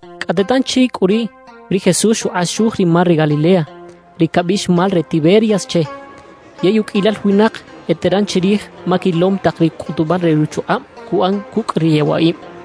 Cꞌate tanchi cꞌu riꞌ, ri Jesús xukꞌaxuj ri mar re Galilea, ri cabiꞌx mar re Tiberias che. Yey uqꞌuiyal winak eteran chirij ma quilom tak ri cꞌutubal re ruchukꞌab cuꞌan cucꞌ ri yewaꞌib.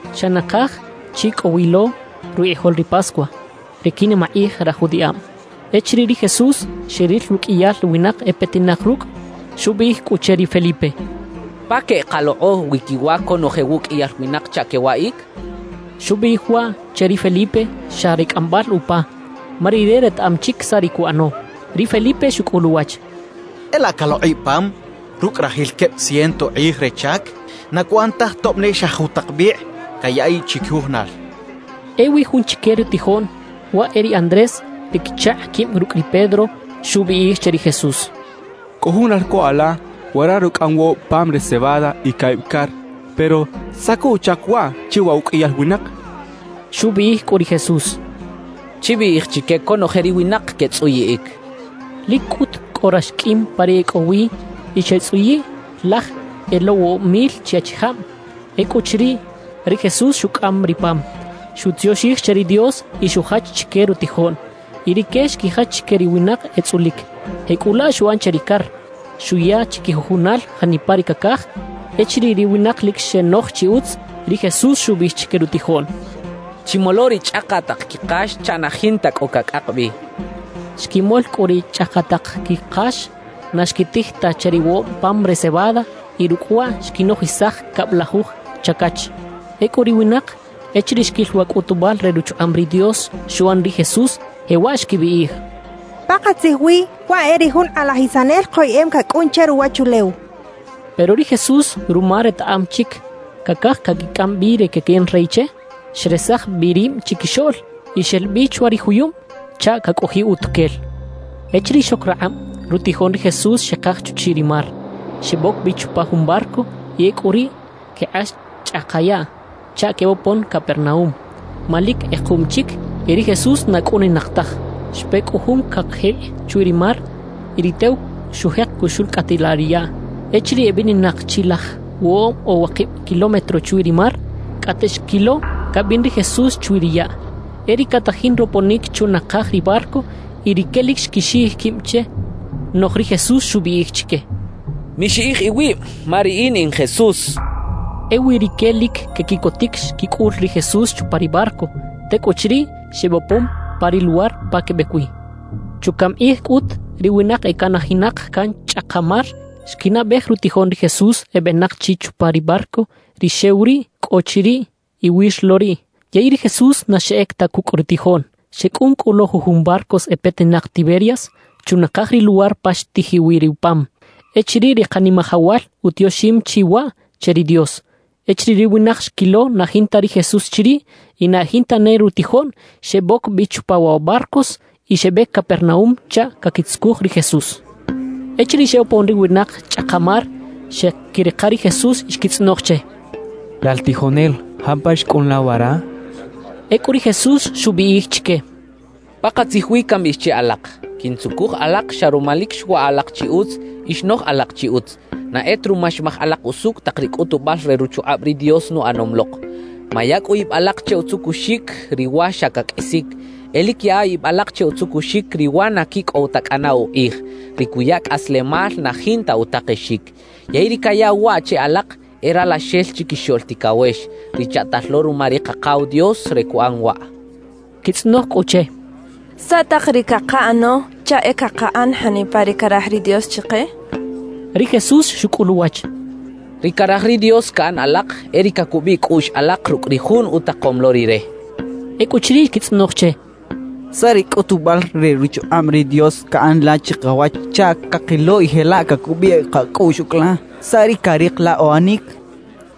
Xa nakaj chi cꞌo wi lo rukꞌijol ri Pascua, ri quinimakꞌij raj judiꞌab. Echiriꞌ ri Jesús xeril ruqꞌuiyal winak e petinak rucꞌ, xubiꞌij cꞌu che ri Felipe: —¿Pa queꞌkalokꞌo wi quiwa conoje wuꞌqꞌuiyal winak chaꞌ quewaꞌic? —xchaꞌ. Xubiꞌij waꞌ che ri Felipe xa re cꞌambal upa, ma Rire retaꞌam chic saꞌ ri cuꞌano. Ri Felipe xucꞌul uwach: —E laꞌ calokꞌiꞌ pam rucꞌ rajil queb ciento kꞌij re chac, na cuꞌan taj tob ne xa jutak bikꞌ cayaꞌiꞌ chiquijujunal —xchaꞌ. Ewi jun chique rutijoꞌn (waꞌ e ri Andrés, ri quichakꞌ quib rucꞌ ri Pedro) xubiꞌij che ri Jesús: —Cꞌo jun ralco ala wara rucꞌaꞌam woꞌob pam re cebada y caꞌib car; pero ¿saꞌ co uchac waꞌ che wa uqꞌuiyal winak? —xchaꞌ. Xubiꞌij cꞌu ri Jesús: —Chibiꞌij chique conoje ri winak quetzꞌuyiꞌic —xchaꞌ. Lic cꞌut cꞌo rax qꞌuim pa ri e cꞌo wi y xetzꞌuyiꞌ laj e lo woꞌob mil chi achijab. Ecꞌuchiriꞌ, ri Jesús xucꞌam ri pam, xutioxij che ri Dios y xujach chique rutijoꞌn. Y rique xquijach chique ri winak etzꞌulic. Jecꞌulaꞌ xuꞌan che ri car. Xuya chiquijujunal janipa ri cacaj. Echiriꞌ ri winak lic xenoj chi utz, ri Jesús xubiꞌij chique rutijoꞌn: —Chimolo ri chꞌakaꞌtaꞌk quikax chaꞌ na jinta cꞌo cacꞌak bi —xchaꞌ. Xquimol cꞌu ri chꞌakaꞌtaꞌk quikax na xquitij ta che ri woꞌob pam re cebada y rucꞌ waꞌ xquinojisaj cablajuj chacach. Ecꞌu ri winak, echiriꞌ xquil wa cꞌutubal re ruchukꞌab ri Dios xuꞌan ri Jesús, jewaꞌ xquibiꞌij: «Pakatzij wi, waꞌ e ri jun Kꞌalajisanel koyeꞌem cacꞌun che ruwachulew» xechaꞌ. Pero ri Jesús ruma retaꞌam chic cacaj caquicꞌam bi re caquiꞌan rey che, xresaj bi rib chiquixoꞌl y xel bi chwa ri juyub chaꞌ cacꞌojiꞌ utuquel. Echiriꞌ xoc rakꞌab, rutijoꞌn ri Jesús xekaj chuchiꞌ ri mar. Xeboc bi chupa jun barco y ecꞌu riꞌ quekꞌax chꞌaka yaꞌ chaꞌ quebopon Capernaúm; ma lic kꞌekuꞌm chic y ri Jesús na cꞌuninak taj. Xpe cꞌu jun cakjikꞌ chwi ri mar y ri tew xujek cuxulcꞌatilaꞌ ri yaꞌ. Echiriꞌ ebininak chi laj woꞌob o wakib kilómetro chwi ri mar, cꞌate xquilo cabin ri Jesús chwi ri yaꞌ, e riꞌ catajin roponic chunakaj ri barco; y rique lic xquixiꞌij quib che. Noꞌj ri Jesús xubiꞌij chique: —¡Mixiꞌij iwib, ma riꞌin in Jesús! —xchaꞌ. Ewi rique lic quequiꞌcotic xquicꞌul ri Jesús chupa ri barco. Tecꞌuchiriꞌ, xebopon pa ri luwar pa quebec wi. Chucaꞌm kꞌij cꞌut, ri winak ecanajinak can chꞌaka mar xquinaꞌbej rutijoꞌn ri Jesús ebenak chi chupa ri barco ri xew riꞌ cꞌo chiriꞌ iwir lo riꞌ, yey ri Jesús na xeꞌec ta cucꞌ rutijoꞌn. Xecꞌun cꞌu lo jujun barcos e petinak Tiberias, chunakaj ri luwar pa xtijiꞌ wi ri pam, echiriꞌ ri Kanimajawal utioxim chi waꞌ che ri Dios. Echiriꞌ ri winak xquilo na jinta ri Jesús chiriꞌ y na e jinta ne rutijoꞌn, xeboc bi chupa wa barcos y xebec Capernaúm chaꞌ caquitzucuj ri Jesús. Echiriꞌ xebopon ri winak chꞌaka mar, xeꞌquirika ri Jesús y xquitzꞌonoj che: —Lal tijonel, ¿jampa xcꞌun la wara? —xechaꞌ. Ecꞌu ri Jesús xubiꞌij chique: —Pakatzij wi cambiꞌij che alak: Quintzucuj alak xa ruma lic xwaꞌ alak chi utz y xnoj alak chi utz, na e ta ruma xmaj alak usucꞌ tak ri cꞌutubal re ruchukꞌab ri Dios nuꞌanom lok. Maya cꞌu ib alak che utzucuxic ri wa xa caqꞌuisic; e lic yaꞌa ib alak che utzucuxic ri wa na quicꞌow ta cꞌana ukꞌij, ri cuya cꞌaslemal na jinta utakexic. Yey ri cayaꞌw waꞌ che alak, e Ralaxel Chiquixoꞌl Ticawex, ri chaꞌtal lo ruma ri Kakaw Dios re cuꞌan waꞌ —xchaꞌ. Xquitzꞌonoj cꞌu che: —¿Saꞌ tak ri cakaꞌano chaꞌ e cakaꞌan janipa ri caraj ri Dios chike? —xechaꞌ. Ri Jesús xucꞌul uwach: —Ri caraj ri Dios caꞌan alak, e ri cacubiꞌ cꞌuꞌx alak rucꞌ ri jun utakom lo Rire —xchaꞌ. Ecꞌuchiriꞌ xquitzꞌonoj che: —¿Saꞌ ri cꞌutubal re ruchukꞌab ri Dios caꞌan la chikawach chaꞌ cakilo y jelaꞌ cacubiꞌ kacꞌuꞌx ucꞌ la? ¿Saꞌ ri carik la uꞌanic?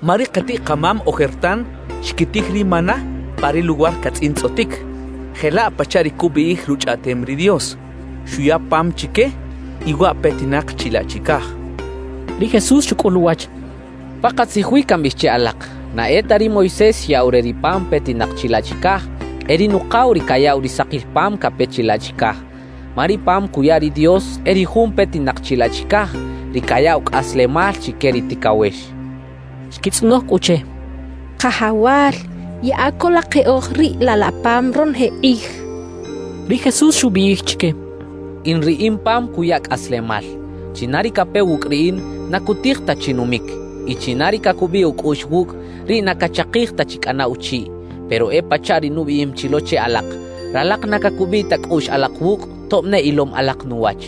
Ma ri katiꞌ-kamam ojertan xquitij ri maná pa ri luwar catzꞌintzꞌotic, jelaꞌ pachaꞌ ri cubiꞌij Ruchꞌaꞌtem ri Dios: Xuya pam chique, y waꞌ petinak chilaꞌ chicaj —xechaꞌ. Ri Jesús xucꞌul uwach: —Pakatzij wi cambiꞌij che alak: Na e ta ri Moisés xyaꞌw re ri pam petinak chilaꞌ chicaj; e ri Nukaw ri cayaꞌw ri sakil pam cape chilaꞌ chicaj. Ma ri Pam cuya ri Dios e ri jun petinak chilaꞌ chicaj, ri cayaꞌw cꞌaslemal chique ri ticawex —xchaꞌ. Xquitzꞌonoj cꞌu che: —Kajawal, yaꞌa co la keꞌoj riꞌ laꞌ la pam ronoje kꞌij —xechaꞌ. Ri Jesús xubiꞌij chique: —In ri in pam cuya cꞌaslemal. China ri cape wucꞌ riꞌin, na cutij ta chi numic; y china ri cacubiꞌ ucꞌuꞌx wucꞌ, riꞌ na cachakij ta chi cꞌana uchiꞌ. »Pero e pachaꞌ ri nubiꞌim chi lo che alak: Ralak na cacubiꞌ ta cꞌuꞌx alak wucꞌ, tob ne ilom alak nuwach.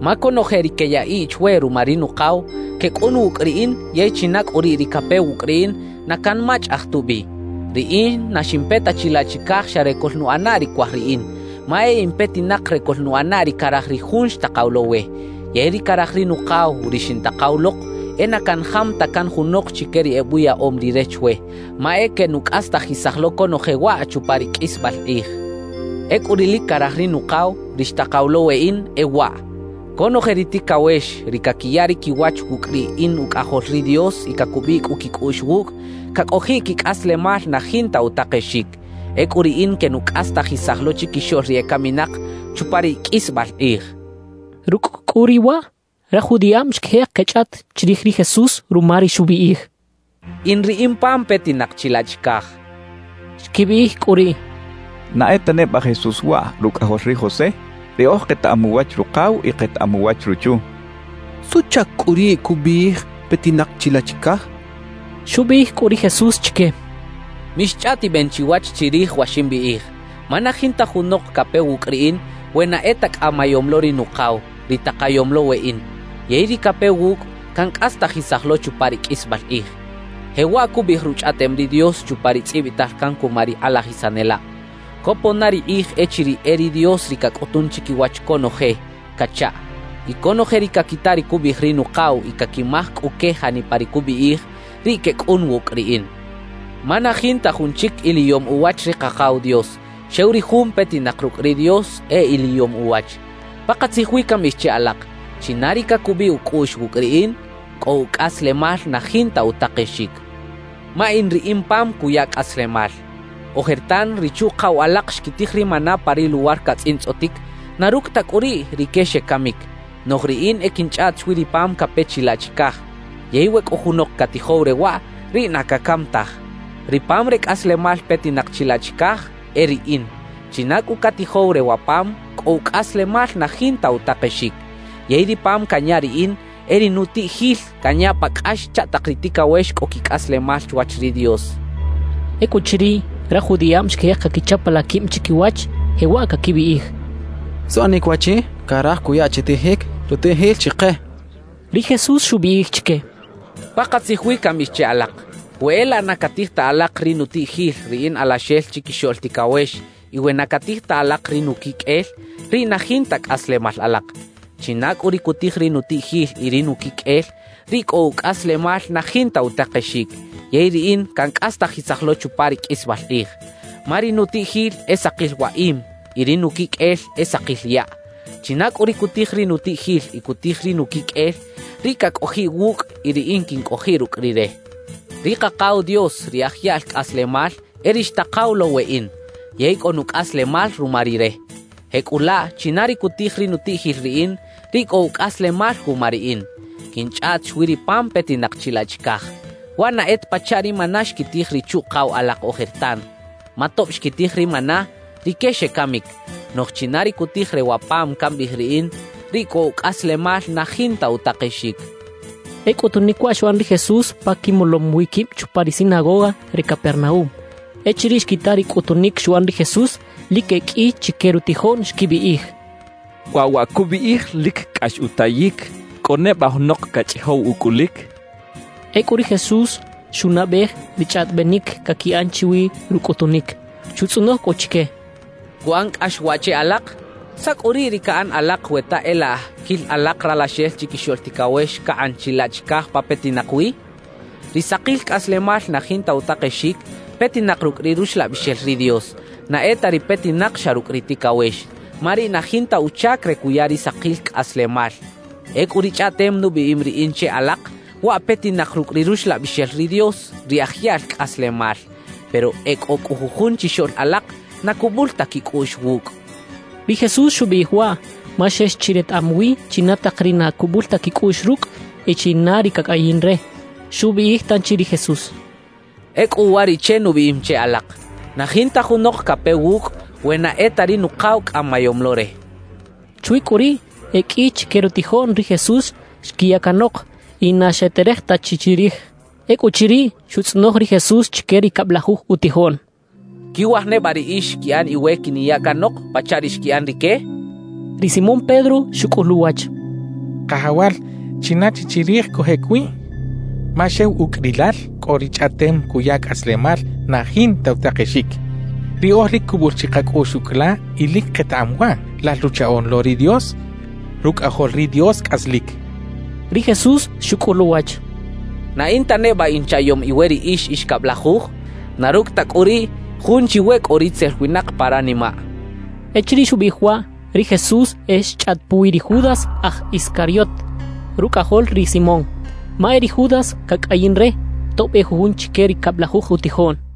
Ma conoje ri queyaꞌiꞌ chwe ruma ri Nukaw, quecꞌun wucꞌ riꞌin; yey china cꞌu riꞌ ri cape wucꞌ riꞌin, na canmachꞌaj tubi. »Riꞌin na ximpe ta chilaꞌ chicaj xa re coꞌlnuꞌana ri cuaj riꞌin, ma e in petinak re coꞌlnuꞌana ri caraj ri Jun xtakaw lo we. Yey ri caraj ri Nukaw, ri xintakaw lok, e na canjam ta can junok chique ri ebuyaꞌom Rire chwe; ma e quenucꞌastajisaj lo conoje waꞌ chupa ri qꞌuisbal kꞌij. Ecꞌu ri lic caraj ri Nukaw, ri xtakaw lo weꞌin, e waꞌ: Conoje ri ticawex, ri caquiya ri quiwach wucꞌ ri in Ucꞌajol ri Dios y cacubiꞌ cꞌu quicꞌuꞌx wucꞌ, cacꞌojiꞌ quicꞌaslemal na jinta utakexic. Ecꞌu riꞌin quenucꞌastajisaj lo chiquixoꞌl ri ecaminak chupa ri qꞌuisbal kꞌij —xchaꞌ. Rucꞌ cꞌu riꞌ waꞌ, raj judiꞌab xquijek quechꞌaꞌt chirij ri Jesús ruma ri xubiꞌij: «In ri in pam petinak chilaꞌ chicaj.» Xquibiꞌij cꞌu riꞌ: «¿Na e ta neba Jesús waꞌ, rucꞌajol ri José? Riꞌoj ketaꞌam uwach rukaw y ketaꞌam uwach ruchu. ¿Suꞌchac cꞌu riꞌ cubiꞌij petinak chilaꞌ chicaj?» xechaꞌ. Xubiꞌij cꞌu ri Jesús chique: —Mixchꞌaꞌtiben chiwach chirij wa ximbiꞌij. Ma na jinta junok cape wucꞌ riꞌin, we na e ta cꞌamayom lo ri Nukaw, ri takayom lo weꞌin. Yey ri cape wucꞌ, cancꞌastajisaj lo chupa ri qꞌuisbal kꞌij. »Jewaꞌ cubiꞌij Ruchꞌaꞌtem ri Dios chupa ri tzꞌibital can cuma ri kꞌalajisanelab: Copon na ri kꞌij echiriꞌ e ri Dios ri cacꞌutun chiquiwach conoje cachaꞌ. Y conoje ri caquita ri cubiꞌij ri Nukaw y caquimaj cꞌu que janipa ri cubiꞌij, riꞌ quecꞌun wucꞌ riꞌin. Ma na jinta jun chic iliyom uwach ri Kakaw Dios; xew ri jun petinak rucꞌ ri Dios, e iliyom uwach. »Pakatzij wi cambiꞌij che alak: China ri cacubiꞌ ucꞌuꞌx wucꞌ riꞌin, cꞌo ucꞌaslemal na jinta utakexic. Ma in ri in pam cuya cꞌaslemal. »Ojertan ri chuꞌkaw alak xquitij ri maná pa ri luwar catzꞌintzꞌotic; na rucꞌ ta cꞌu riꞌ, rique xecamic. Noꞌj riꞌin e quinchꞌaꞌt chwi ri pam cape chilaꞌ chicaj; yey we cꞌo junok catijow re waꞌ, riꞌ na cacam taj. »Ri pam re cꞌaslemal petinak chilaꞌ chicaj e riꞌin. China cꞌu catijow re wa pam, cꞌo ucꞌaslemal na jinta utakexic. Yey ri pam canya riꞌin, e ri nutiꞌjil canya pa cꞌax chaꞌ tak ri ticawex cꞌo quicꞌaslemal chwach ri Dios —xchaꞌ. Ecꞌuchiriꞌ, raj judiꞌab xquijek caquichapalaꞌ quib chiquiwach, jewaꞌ caquibiꞌij: «¿Suꞌanic waꞌchi caraj cuya chitijic rutiꞌjil chike?» quechaꞌ. Ri Jesús xubiꞌij chique: —Pakatzij wi cambiꞌij che alak: We e laꞌ na catij ta alak ri nutiꞌjil ri in Alaxel Chiquixoꞌl Ticawex y we na catij ta alak ri nuquiqꞌuel, riꞌ na jinta cꞌaslemal alak. China cꞌu ri cutij ri nutiꞌjil y ri nuquiqꞌuel, riꞌ cꞌo ucꞌaslemal na jinta utakexic, yey riꞌin cancꞌastajisaj lo chupa ri qꞌuisbal kꞌij. Ma ri nutiꞌjil e sakil waꞌim y ri nuquiqꞌuel e sakil yaꞌ. China cꞌu ri cutij ri nutiꞌjil y cutij ri nuquiqꞌuel, riꞌ cacꞌojiꞌ wucꞌ y riꞌin quincꞌojiꞌ rucꞌ rire. »Ri Kakaw Dios, ri aj yaꞌl cꞌaslemal, e ri xtakaw lo weꞌin; yey cꞌo nucꞌaslemal ruma Rire. Jecꞌulaꞌ china ri cutij ri nutiꞌjil riꞌin, riꞌ cꞌo ucꞌaslemal wuma riꞌin. Quinchꞌaꞌt chwi ri pam petinak chilaꞌ chicaj. Waꞌ na e ta pachaꞌ ri maná xquitij ri chuꞌkaw alak ojertan. Ma tob xquitij ri maná, rique xecamic. Noꞌj china ri cutij re wa pam cambiꞌij riꞌin, riꞌ cꞌo ucꞌaslemal na jinta utakexic —xchaꞌ. E cꞌutunic waꞌ xuꞌan ri Jesús pa quimolom wi quib chupa ri sinagoga re Capernaúm. Echiriꞌ xquita ri cꞌutunic xuꞌan ri Jesús, lic e qꞌui chique rutijoꞌn xquibiꞌij: «Waꞌ wa cubiꞌij, lic cꞌax utayic. ¿Cꞌo neba junok cachꞌijow ucꞌulic?» xechaꞌ. Ecꞌu ri Jesús xunaꞌbej ri chꞌaꞌtibenic caquiꞌan chwi rucꞌutunic. Xutzꞌonoj cꞌu chique: —¿Cuꞌan cꞌax waꞌ che alak? ¿Saꞌ cꞌu riꞌ ri caꞌan alak we ta e laꞌ quil alak Ralaxel Chiquixoꞌl Ticawex cakꞌan chilaꞌ chicaj pa petinak wi? Ri sakil cꞌaslemal na jinta utakexic petinak rucꞌ ri Ruxlabixel ri Dios; na e ta ri petinak xa rucꞌ ri ticawex, ma riꞌ na jinta uchac re cuya ri sakil cꞌaslemal. Ecꞌu ri chꞌaꞌtem nubiꞌim riꞌin che alak, waꞌ petinak rucꞌ ri Ruxlabixel ri Dios, ri aj yaꞌl cꞌaslemal. Pero e cꞌo cꞌu jujun chixoꞌl alak na cubul ta quicꞌuꞌx wucꞌ —xchaꞌ. Ri Jesús xubiꞌij waꞌ ma xex chi retaꞌam wi china tak ri na cubul ta quicꞌuꞌx rucꞌ y china ri cacꞌayin re. Xubiꞌij tanchi ri Jesús: —Ecꞌu uwariꞌche nubiꞌim che alak: Na jinta junok cape wucꞌ, we na e ta ri Nukaw cꞌamayom lo re —xchaꞌ. Chwi cꞌu riꞌ, e qꞌui chique rutijoꞌn ri Jesús xquiya canok y na xeterej ta chi chirij. Ecꞌuchiriꞌ, xutzꞌonoj ri Jesús chique ri cablajuj utijoꞌn: —¿Quiwaj neba riꞌix quiꞌan iwe quiniya canok, pachaꞌ ri xquiꞌan rique? —xchaꞌ. Ri Simón Pedro xucꞌul uwach: —Kajawal, ¿china chi chirij cojꞌec wi? Ma xew ucꞌ rilal cꞌo ri chꞌaꞌtem cuya cꞌaslemal na jinta utakexic. Riꞌoj lic cubul chi kacꞌuꞌx ucꞌ la y lic ketaꞌam waꞌ: Lal Ruchaꞌoꞌn lo ri Dios, Rucꞌajol ri Dios cꞌaslic —xchaꞌ. Ri Jesús xucꞌul uwach: —¿Na in ta neba inchaꞌyom iwe riꞌix ix cablajuj? Na rucꞌ ta cꞌu riꞌ, jun chiwe cꞌo ritzel winak pa ranimaꞌ —xchaꞌ. Echiriꞌ xubiꞌij waꞌ, ri Jesús e xchꞌaꞌt puwi ri Judas aj Iscariot rucꞌajol ri Simón; ma e ri Judas cacꞌayin re, tob e jun chique ri cablajuj utijoꞌn.